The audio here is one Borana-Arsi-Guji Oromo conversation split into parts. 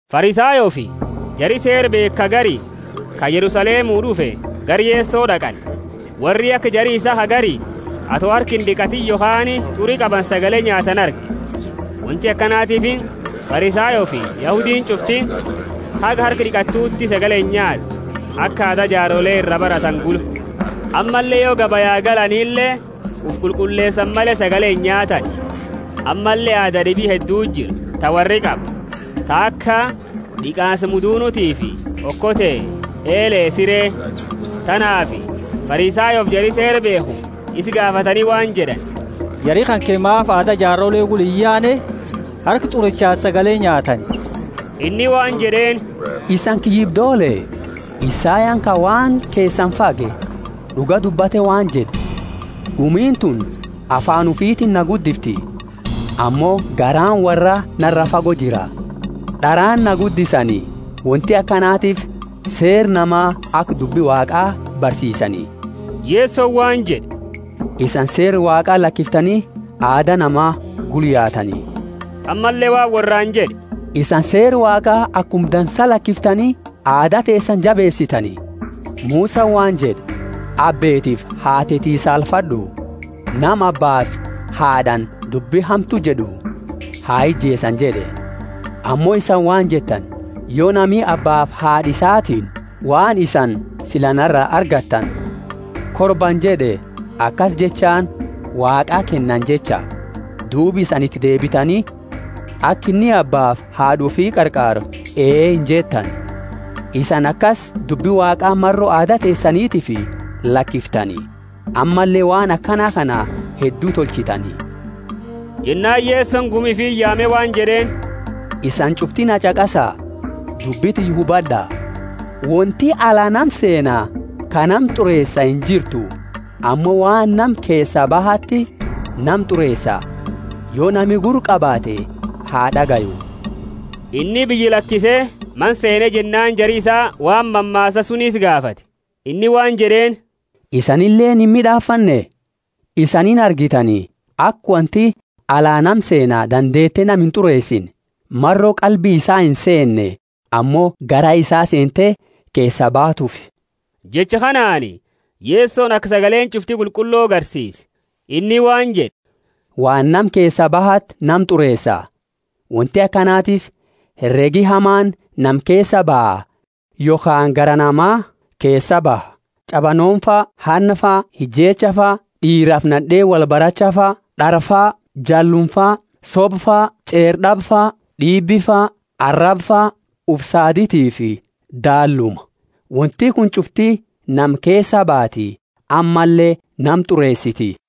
Farisayoofi jari Seera beekhu ka gari, ka Yerusalemu d'ufe, gara Yeso d'aqani. Worri aka jari isaa ka gari, ato harka ind'iqatiini yokhaani t'uri qabanu sagale nyaatani arge. Wonti akanatiifi Farisayoofi Yahudiini ch'ufti, haga harka d'iqatuuti sagale inyaattu, aka aada jaarole ira baratani gula; ammalle yo gabaya galanile ufi qulqulleesani male sagale inyaatani; ammalle aada d'ibi hedduti jira, ta worri qabu, ta aka d'iqaansa mudunutiifi okote, eele, sire. Tanaafi Farisayoofi jari Seera beekhu isa gaafatani waan jed'ani, Jari kanke maafi aada jaarole gula iyaane, harka t'urichaani sagale nyaatani? Inni waan jed'eeni, Isani kiyyibdoole, Isayani ka waan keesani fage, d'uga dubbate waan jed'e, Gumiini tuni afaani ufitiini na guddifti, ammo garaani worraa nara fago jira. D'araani na guddisani; wonti akanatiifi seera nama aka dubbi Waaqa barsiisani. Yesoni waan jed'e, Isani Seera Waaqa lakiftani, aada nama gula yaatani. Ammalle waan worraani jed'e, Isani Seera Waaqa akuma dansa lakiftani, aada teesani jabeesitani! Musani waan jed'e, Abbeetiifi haateti saalfad'u, nama abbaafi haad'aani dubbi hamtu jed'u ha ijeesani jed'e. Ammo isani waan jettani, Yo nami abbaafi haad'a isatiini, Waan isani sila nara argattani Korbani jed'e (akasi jechaani Waaqaa kennani jecha), duuba isani iti deebitani, aka inni abbaafi haad'a ufi qarqaaru ee injettani. Isani akasi dubbi Waaqa maro aada teesanitiifi lakiftani, ammalle waan akana kana heddu tolchitani. Jennaani Yesoni gumi ufiti yaame waan jed'eeni, Isani ch'ufti na ch'aqasa, dubbi tiyya hubad'a. Wonti ala nama seena ka nama t'ureesa injirtu, ammo waan nama keesa bahati nama t'ureesa. [ Yo nami gurra qabaate ha d'agayu.] Inni biyya lakise mana seene jennaani jari isaa waan mammaasa suni isa gaafate. Inni waan jed'eeni, Isanileeni imid'aafanne? Isani inargitani, aka wonti ala nama seena dandeete nama int'ureesine, maro qalbi isaa inseenne, ammo gaara isaa seente keesa baatuufi. (Jecha kanaani Yesoni aka sagaleeni ch'ufti qulqullo garsiise.) Inni waan jed'e, Waan nama keesaa bahati nama t'ureesa. Wonti akanatiifi heregi hamaani nama keesaa baha, yokhaani garaa nama keesaa baha: ch'abanoomafa, hannafa, ijeechafa, d'iirafi nad'eeni wolbarachafa, d'araafa, jallumafa, sobafa, ch'eera d'abafa, d'iibifa, arabafa, ufi saaditifi daalluma — wonti kuni ch'ufti nama keesaa baati, ammalle nama t'ureesiti.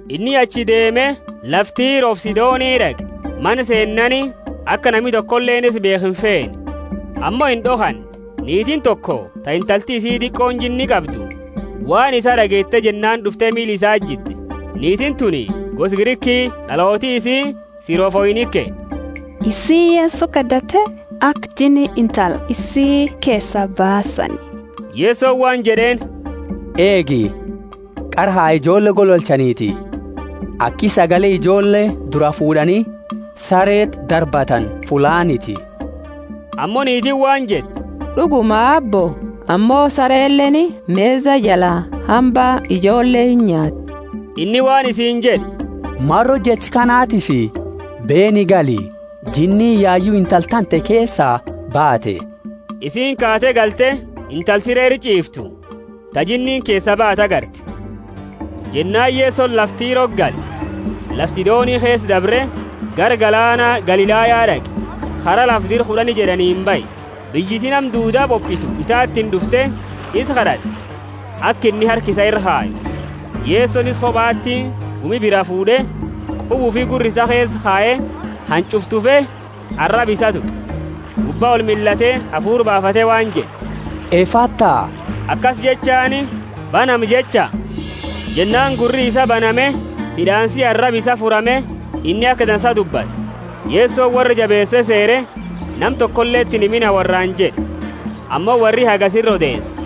Inni achii deeme, lafa Tirofi Sidoni d'aqe. Mana seennaani, aka nami tokoleeni isa beekhu imfeene, ammo ind'okhanne. Niitiini toko ta intalti isi diqooni jinni qabdu waan isaa d'ageete jennaani d'ufte miila isaati jidde. Niitiini tuni gosa Griki, d'alooti isii Sirofoinike. Isiini Yeso kad'atte aka jinni intala isi keesaa baasani. Yesoni waan jed'eeni, Eegi, qara ha ijoolle gololchaniti, aki sagale ijoolle duraa fuud'ani sareti darbatani fullaaniti. Ammo niitiini waan jette, D'uguma, Aabbo, ammo sareleeni mesa jala hamba ijoolle inyaatti. Inni waan isiini jed'e, Maro jecha kanatifi beeni gali, jinniini yayu intala tante keesaa baate. Isiini kaate galte, intala sire ira ch'iiftu ta, jinniini keesaa baate agarte. Jennaani Yesoni lafa Tiroti gale, lafa Sidoni keesa dabre, gara galaana Galilaya d'aqe, kara lafa Dira Kud'ani jed'aniini bahe. Biyyiti nama duuda bopisu isatiini d'ufte, isa kad'atte, aka inni harka isaa ira kayu. Yesoni isa kobati gumi biraa fuud'e, quba ufi gurra isaa keesa kaye, hanch'ufa tufe, araba isaa tuqe, gubba olmillate, hafuura baafate waan jed'e, Efatha, akasi jechaani, Banami jecha. Jennaani gurri isaa baname, hid'aansi araba isaa furame, inni aka dansa dubbate. Yesoni worra jabeese seere, Nama tokoleti inhimina worraani jed'e; ammo worri hagasi ira odeese.